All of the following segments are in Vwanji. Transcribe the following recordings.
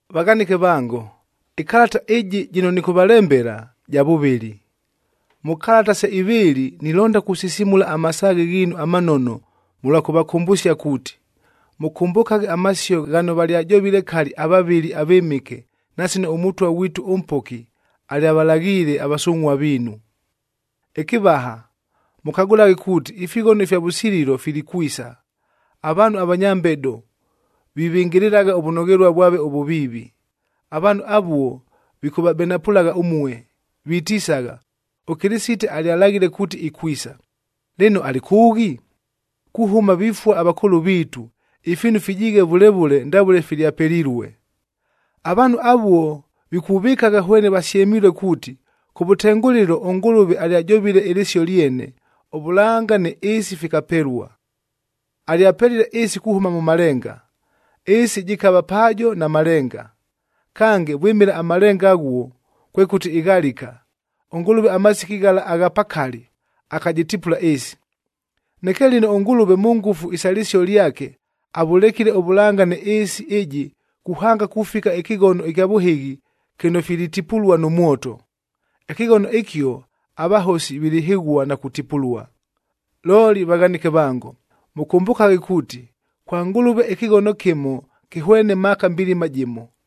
Vaghanɨke vango, ɨkalata ɨjɨ jɨno nɨkʉvalembela, ja vʉvɨlɨ. Mʉ kalata se ivɨɨlɨ nilonda kusisimula amasaaghe ghiinu amanono mʉlwa kʉvakʉmbʉsia kuuti, mʉkʉmbʉkaghe amasio ghano valyajovile kali avavɨli avɨmɨke na sino ʉMʉtwa ghwitu, ʉMpoki, alyavalaghiile avasungʼhua viinu. Ɨkɨvaha, mʉkagʉlaghe kuuti ifighono ifya vʉsililo vilikwisa, avaanhu avanya mbedo vivɨngɨlɨlagha ʉvʉnoghelua vwave ʉvʉviivi. Avaanhu avuo vikʉvabenapʉlagha ʉmue, vitisagha, “ɄKɨlɨsite alyalaghile kuuti ikwisa! Lɨno alɨ kʉʉghi? Kuhʉma vifua avakʉʉlʉ viitu, ifiinu fijiighe vʉle vʉle ndavʉle filyapelilue.” Avaanhu avuo, vikuvɨkagha hwene vasyemilue kuuti, kʉvʉtengʉlɨlo ʉNgʉlʉve alyajovile ɨlɨsio lyene, ʉvʉlanga nɨ ɨɨsi fikapelua. Alyapelile ɨɨsi kuhʉma mʉ malenga, ɨɨsi jɨkava paajo na malenga. Kange, vwɨmɨla amalenga aghuo, kwekʉti ɨghalika, ʉNgʉlʉve amasiki ghala agha pakali, akajɨtipula ɨɨsi. Neke lɨno, ʉNgʉlʉve mʉ ngʉfu isa lɨsio lyake avʉlekile ʉvʉlanga nɨ ɨɨsi ɨjɨ kuhanga kufika ɨkɨghono ɨkya vʉhɨghi kɨno filitipulua nʉ mwoto. Ɨkɨghono ɨkio avahosi vilihɨghua na kutipulua. Looli vaghanɨke vango, mʉkʉmbʉkaghe kuuti, kwa Ngʉlʉve ɨkɨghono kɨmo kɨhwene maaka mbilima jɨmo,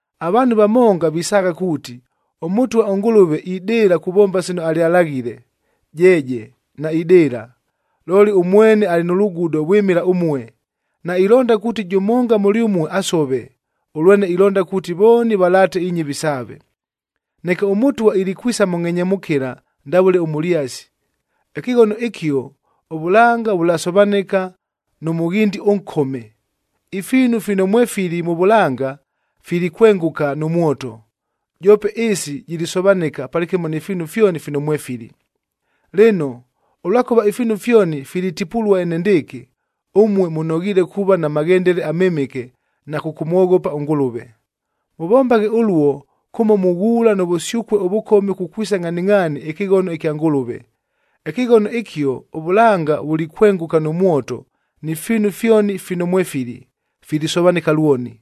Avaanhu vamonga visaagha kuuti, ʉMʉtwa ʉNgʉlʉve idɨɨla kuvomba sino alyalaghile. Jeeje, naidɨɨla, looli ʉmwene alɨ nʉ lugudo vwɨmɨla ʉmue, nailonda kuuti jʉmonga mʉlyʉmue asove, ʉlwene ilonda kuuti vooni valaate inyɨvi saave. Neke ʉMʉtwa ilikwisa mʉ ngʼhenyemʉkɨla ndavʉle ʉmʉlyasi. Ɨkɨghono ɨkio, ʉvʉlanga vʉlasovanɨka nʉ mʉghindi ʉnkome. Ifiinu fino mwefili mʉ vʉlanga filikwengʉka nʉ mwoto, joope ɨɨsi jilisovanɨka palɨkɨmo ni fiinu fyoni fino mwefili. Lɨno, ʉlwakʉva ifiinu fyoni filitipulua enendɨɨkɨ, ʉmue mʉnoghiile kuuva na maghendele amɨmɨke na kʉkʉmwoghopa ʉNgʉlʉve. Mʉvombaghe ʉluo kʉmo mughuula nʉ vʉsyʉkue ʉvʉkome kukwisa ngʼhaningʼhaani ɨkɨghono ɨkya Ngʉlʉve. Ɨkɨghono ɨkio, ʉvʉlanga vulikwengʉka nʉ mwoto ni fiinu fyoni fino mwefili, filisovanɨka lwoni.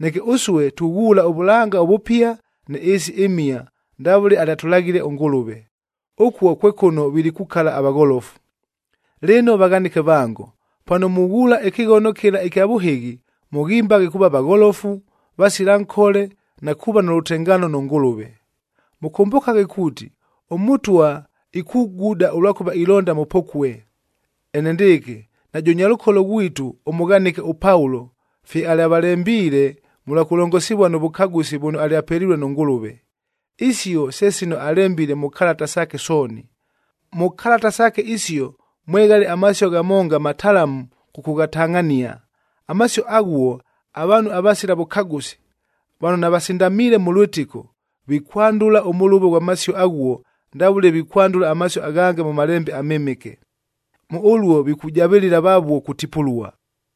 Neke ʉsue, tughuula ʉvʉlanga ʉvʉpia nɨ ɨɨsi ɨmhia ndavʉle alyatʉlaghile ʉNgʉlʉve. Ʉkuo kwe kʉno vilikukala avagholofu. Lɨno vaghanɨke vango, pano mughuula ɨkɨghono kɨla ɨkya vʉhɨghi, mʉghimbaghe kuuva vagholofu, vasila nkole na kuuva nʉ lʉtengaano nʉ Ngʉlʉve. Mʉkʉmbʉkaghe kuuti ʉMʉtwa ikuguda, ʉlwakʉva ilonda mʉpokue. Enendɨɨkɨ, najʉ nyalʉkolo ghwitu ʉmʉghanɨke ʉPaulo fye alyavalembiile mʉlwa kʉlongosivua nʉ vʉkagʉsi vʉno alyapelilue nʉ Ngʉlʉve. Isio se sino alembile mʉ kalata saake sooni. Mʉ kalata saake isio mweghale amasio ghamonga matalamu kʉkʉghatangʼhania. Amasio aghuo, avaanhu avasila vʉkagʉsi, vano navasindamiile mʉ lwɨtɨko, vikwandʉla ʉmʉlʉvo ghwa masio aghuo ndavʉle vikwandʉla amasio aghange mʉ Malembe aMɨmɨke. Mʉ ʉluo, vikujavɨlɨla vavuo kutipulua.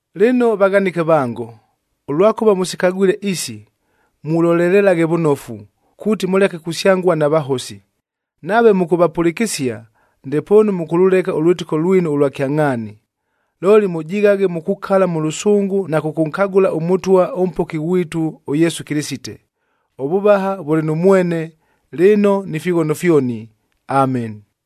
Lɨno vaghanɨke vango, ʉlwakʉva mʉsikagwile isi, mulolelelaghe vʉnofu, kuuti mʉleke kusyangua na vahosi. Nave mʉkʉvapʉlɨkɨsia, ndepoonu mʉkʉlʉleka ʉlwɨtɨko lwinu ʉlwa kyangʼhaani. Looli mʉjighaghe mukukala mʉ lʉsʉngʉ na kʉkʉnkagʉla ʉMʉtwa, ʉMpoki ghwitu ʉYesu Kɨlɨsite. Ʉvʉvaha vʉlɨ nʉ mwene, lɨno ni fighono fyoni! Ameni.